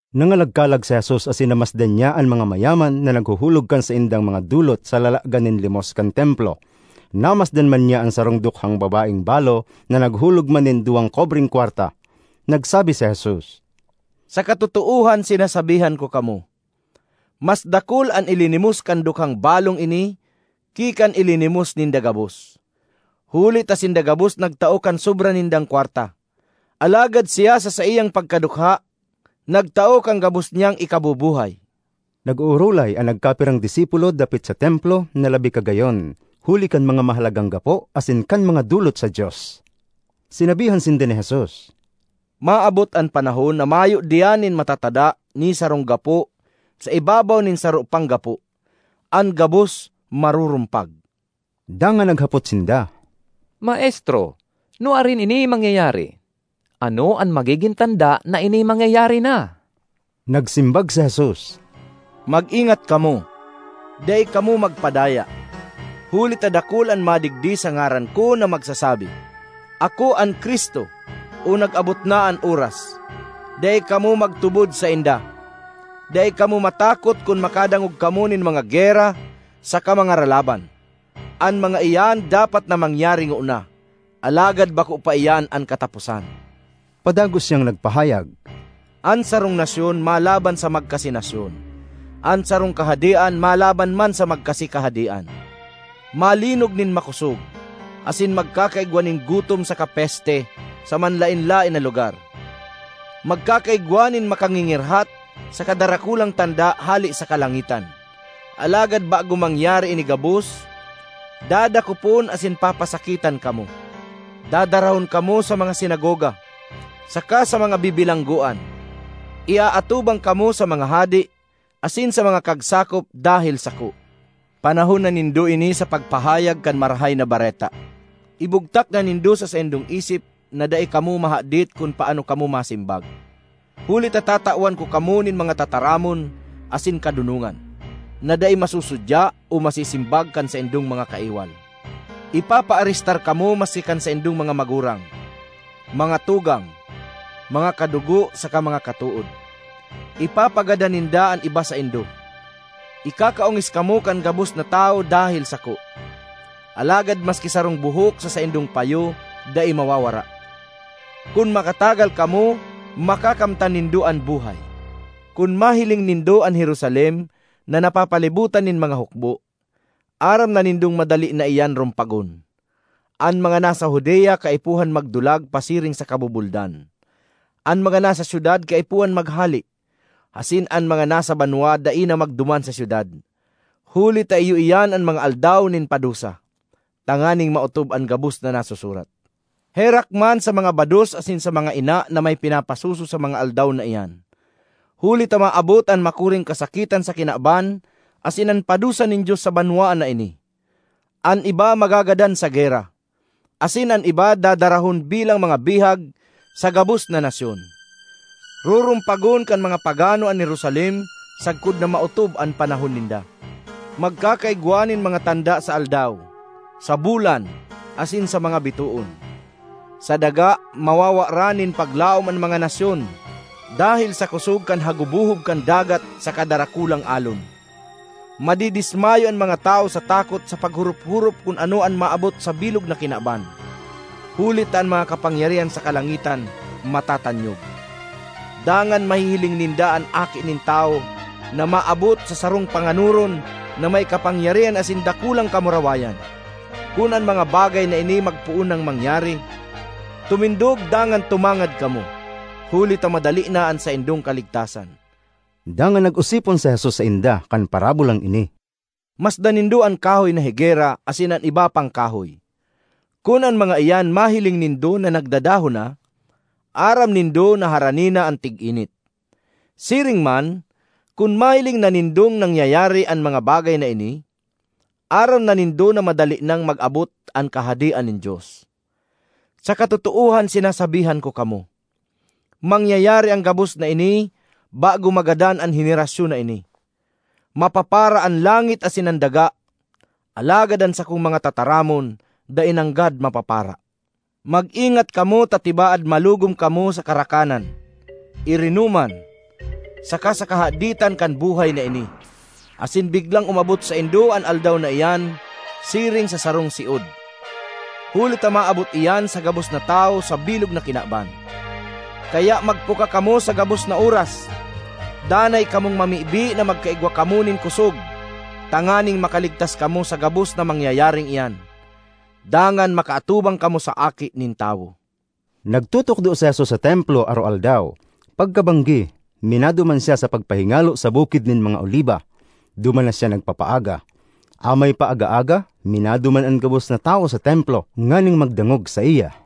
Nangalagkalag si Jesus asin namasdan niya an mga mayaman na naghuhulog kan saindang mga dolot sa lalagan nin limos kan Templo. Namasdan man niya an sarong dukhang babaeng balo na naghulog man nin duwang kobreng kwarta. Nagsabi si Jesus, “Sa katotoohan sinasabihan ko kamo, mas dakul an ilinimos kan dukhang balong ini ki kan ilinimos ninda gabos; huli ta sinda gabos nagtao kan sobra nindang kwarta, alagad siya sa saiyang pagkadukha, nagtao kan gabos niyang ikabubuhay.” Nag-oorolay an nagkapirang disipulo dapit sa Templo na labi kagayon huli kan mga mahalagang gapo asin kan mga dolot sa Dios. Sinabihan sinda ni Jesus, ”Maabot an panahon na mayo diyan nin matatada ni sarong gapo sa ibabaw nin saro pang gapo; an gabos marurumpag.” Dangan naghapot sinda, “Maestro, nuarin ini mangyayari? Ano an magigin tanda na ini mangyayari na?” Nagsimbag si Jesus, “Mag-ingat kamo; dai kamo magpadaya. Huli ta dakul an madigdi sa ngaran ko na magsasabi, ‘Ako an Cristo!’ o ‘Nag-abot na an oras!’ Dai kamo magtubod sainda. Dai kamo matakot kun makadangog kamo nin mga gera saka mga ralaban. An mga iyan dapat na mangyari ngona, alagad bako pa iyan an kataposan.” Padagos siyang nagpahayag, “An sarong nasyon malaban sa magkasi nasyon; an sarong kahadean malaban man sa magkasi kahadean; malinog nin makosog, asin magkakaigwa nin gutom saka peste sa manlaen-laen na lugar; magkakaigwa nin makangingirhat saka darakulang tanda hale sa kalangitan. Alagad bago mangyari ini gabos, dadakopon asin papasakitan kamo; dadarahon kamo sa mga sinagoga, saka sa mga bibilanggoan; iaatubang kamo sa mga hade asin sa mga kagsakop dahel sako. Panahon na nindo ini sa pagpahayag kan Marahay na Bareta. Ibugtak na nindo sa saindong isip na dai kamo mahadit kun paano kamo masimbag, huli ta tatawan ko kamo nin mga tataramon asin kadonongan, na dai masusudya o masisimbag kan saindong mga kaiwal. Ipapaarestar kamo maski kan saindong mga magurang, mga tugang, mga kadugo saka mga katood; ipapagadan ninda an iba saindo. Ikakaongis kamo kan gabos na tawo dahel sako. Alagad maski sarong buhok sa saindong payo dai mawawara. Kun makatagal kamo, makakamtan nindo an buhay. ”Kun mahiling nindo an Jerusalem na napapalibotan nin mga hukbo, aram na nindong madali na iyan rumpagon. An mga nasa Judea kaipuhan magdulag pasiring sa kabubuldan; an mga nasa syudad kaipuhan maghale, asin an mga nasa banwa dai na magduman sa syudad. Huli ta iyo iyan an ‘Mga Aldaw nin Padusa,’ tanganing maotob an gabos na nasusurat. Herak man sa mga bados asin sa mga ina na may pinapasuso sa mga aldaw na iyan! Huli ta maabot an makuring kasakitan sa kinaban asin an padusa nin Dios sa banwaan na ini. An iba magagadan sa gera, asin an iba dadarahon bilang mga bihag sa gabos na nasyon; rurumpagon kan mga pagano an Jerusalem sagkod na maotob an panahon ninda. ”Magkakaigwa nin mga tanda sa aldaw, sa bulan, asin sa mga bitoon. Sa daga, mawawaran nin paglaom an mga nasyon dahel sa kosog kan hagubohob kan dagat saka darakulang alon. Madidismayo an mga tawo sa takot sa paghorop-horop kun ano an maabot sa bilog na kinaban, huli ta an mga kapangyarihan sa kalangitan matatanyog. Dangan mahihiling ninda an Aki nin Tawo na maabot sa sarong panganoron na may kapangyarihan asin dakulang kamurawayan. Kun an mga bagay na ini magpoon nang mangyari, tumindog dangan tumangad kamo, huli ta madali na an saindong kaligtasan.” Dangan nag-osipon si Jesus sainda kan parabolang ini, “Masdan nindo an kahoy na higera asin an iba pang kahoy. Kun an mga iyan mahiling nindo na nagdadahon na, aram nindo na harani na an tig-init. Siring man, kun mahiling na nindong nangyayari an mga bagay na ini, aram na nindo na madali nang mag-abot an Kahadean nin Dios. ”Sa katotoohan sinasabihan ko kamo, mangyayari an gabos na ini bago magadan an henerasyon na ini. Mapapara an langit asin an daga, alagad an sakong mga tataramon dai nanggad mapapara. ”Mag-ingat kamo ta tibaad malugom kamo sa karakanan, irinoman, saka sa kahaditan kan buhay na ini, asin biglang umabot saindo an Aldaw na iyan siring sa sarong siod; huli ta maabot iyan sa gabos na tawo sa bilog na kinaban. Kaya magpuka kamo sa gabos na oras; danay kamong mamibi na magkaigwa kamo nin kosog tanganing makaligtas kamo sa gabos na mangyayaring iyan, dangan makaatubang kamo sa Aki nin Tawo.” Nagtutukdo si Jesus sa Templo aroaldaw; pagkabanggi, minaduman siya sa pagpahingalo sa Bukid nin mga Oliba; duman na siya nagpapaaga. Amay pa aga-aga, minaduman an gabos na tawo sa Templo nganing magdangog saiya.